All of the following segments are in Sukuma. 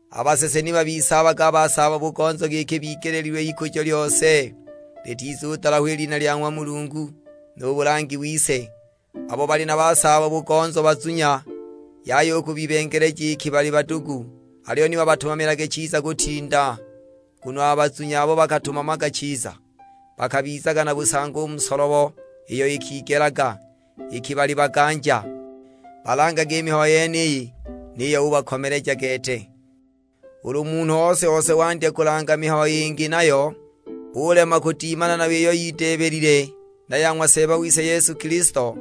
A basese ni babisaabage a basaabo-bugonzo giki bigeleelilwe ikujo lyose, litizudalahwa i lina lya ng'wa Mulungu, nu bulangi wise. Abo bali na basaabo-bugonzo bazunya, yaya u kubibengeleja iki bali badugu, aliyo ni babatumamilage chiza kutinda. Nguno a bazunya abo bakatumamaga chiza, bakabizaga na busangi u mu solobo iyo ikigelaga, iki bali baganja. Balangage i mihayo yeniyi, niyo ubakomeleja gete. Ulu munhu ose-ose wandya kulanga mihayo yingi nayo, ulema kudimana nayo iyo yideebelile na ya ng'wa Seeba wise Yesu Kilisto,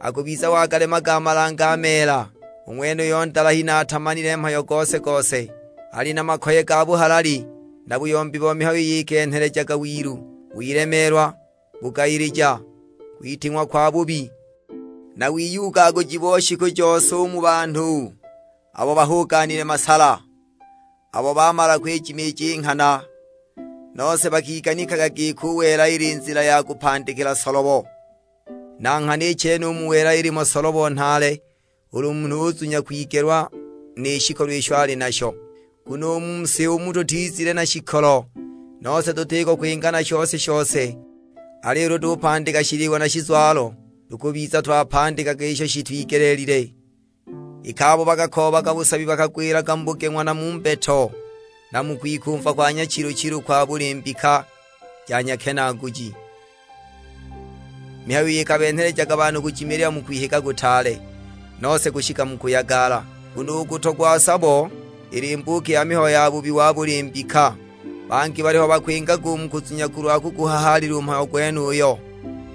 akubiza wagalemaga a malange a meela. U ng'wenuyo ndalahi, na atamanile mhayo gose-gose. Ali na makoye ga buhalali na buyombi bo mihayo iyo ikenhelejaga wilu, wilemeelwa, bugayilija, kwiting'wa kwabubi, na wiyugaguji bo shiku jose u mu banhu abo bahuganile masala, abo baamala kwijimiija i nghana, nose bakiganikaga giki u wela ili nzila ya kupandikila solobo! Na nghana i chene u mu wela ilimo solobo nhaale, ulu munhu uzunya kwigelwa ni shikolo isho ali nasho. Nguno u mu si umu tutizile na shikolo, nose tutiko kwinga na shose-shose. Aliyo ulu tupandika shiliwa na shizwalo, tukubiza twapandikaga isho shitwigelile. Iki abo bakakoobaga busabi bakagwilaga mu bugeng'wa na mu mbeto, na mu kwikumva kwa nyachilu-chilu kwa buli mbika ja nyakenaaguji, mihayo iyo ikabenhelejaga banhu kujimilila mu kwihiga kutaale, nose kushika mu kuyagala! Nguno u kutogwa sabo ili mbuuki ya mihayo ya bubi wa buli mbika, bangi baliho bakwingaga u mu kuzunya kulwa kuguhahaalila u mhayo gwenuyo,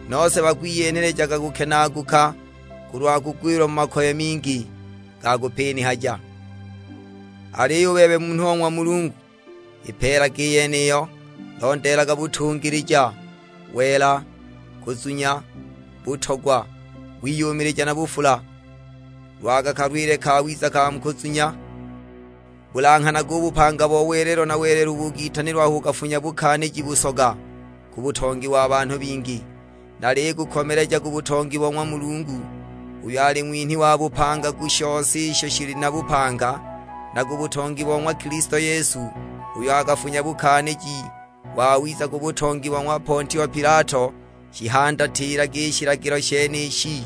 nose bakwiyenhelejaga kukenaaguka, kulwa kugwila mu makoye mingi ga kupinihaja! Aliyo u bebe munhu o ng'wa Mulungu, ipeelage i yeniyo; londeelaga butungilija, wela, kuzunya, butogwa, wiyumilija na bufula. Lwaga kalwiile kawiza ka mu kuzunya; bulanghanage u bupanga bo welelo na welelo ubo ukitanilwa aho ukafunya bukaaniji busoga ku butongi wa banhu bingi. Nalikukomeleja ku butongi bo ng'wa Mulungu, uyo ali ng'winhi wa bupanga ku shose isho shili na bupanga; na ku butongi bo ng'wa Kilisto Yesu, uyo akafunya bukaaniji wawiza ku butongi bo ng'wa Pontio Pilato. Shihandatilage i shilagilo shenishi,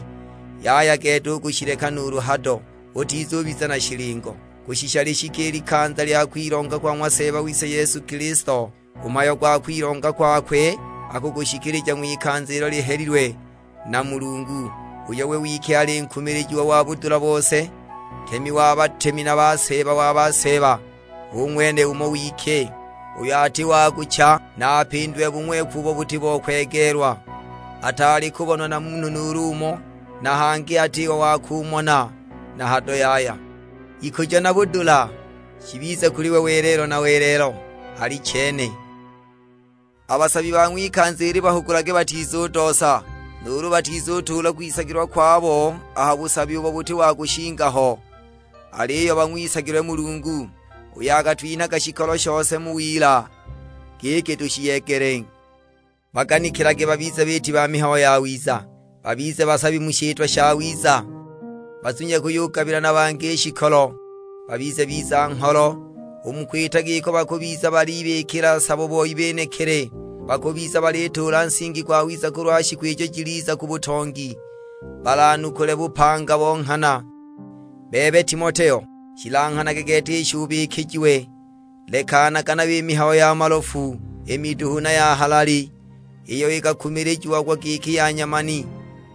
yaya gete u kushileka nuulu hado. Utizubiza na shilingo, kushisha lishike i likanza lya kwilonga kwa ng'wa Seeba wise Yesu Kilisto. U mhayo gwa kwilonga kwakwe akugushikilija ng'wikanza ilo lihelilwe na Mulungu, uyo we wike ali nkumilijiwa wa budula bose; Ntemi wa batemi na Seeba wa baseeba. Hu ng'wene umo we wike, uyo ati wa kucha, na apindiwe bung'weku ubo buti bo kwegeelwa. Ataali kubonwa na munhu nuulu umo, na hangi atiho wa kumona na hado yaya. Ikujo na budula shibize kuli we welelo na welelo: Alichene. A basabi ba ng'wikanza ili bahugulage batizudoosa, nuulu batizutuula kwisagilwa kwabo ha busabi ubo buti wa kushinga ho; aliyo bang'wisagilwe Mulungu, uyo akatwinhaga shikolo shose mu wila giki tushiyegele. Baganikilage babize biiti ba mihayo yawiza, babize basabi mu shitwa shawiza, bazunye kuyugabila na bangi i shikolo; babize biza-ngholo. U mu kwita giko bakubiza balibikila sabo boi benekili, bakubiza balituula nsingi gwawiza kulwa shiku ijo jiliza ku butongi, balanukule bupanga bo nghana. Bebe Timoteo, shilanghanage gete isho ubikijiwe; lekanaga nayo i mihayo ya malofu, i miduhu na ya halali; iyo ikakumilijiagwa giki ya nyamani,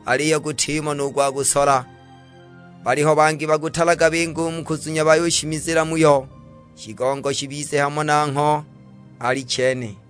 aliyo gutimo nu gwa kusola. Baliho bangi bakutalaga binga u mu kuzunya bayushimizila muyo. Shigongo shibize hamo nangho: Alichene.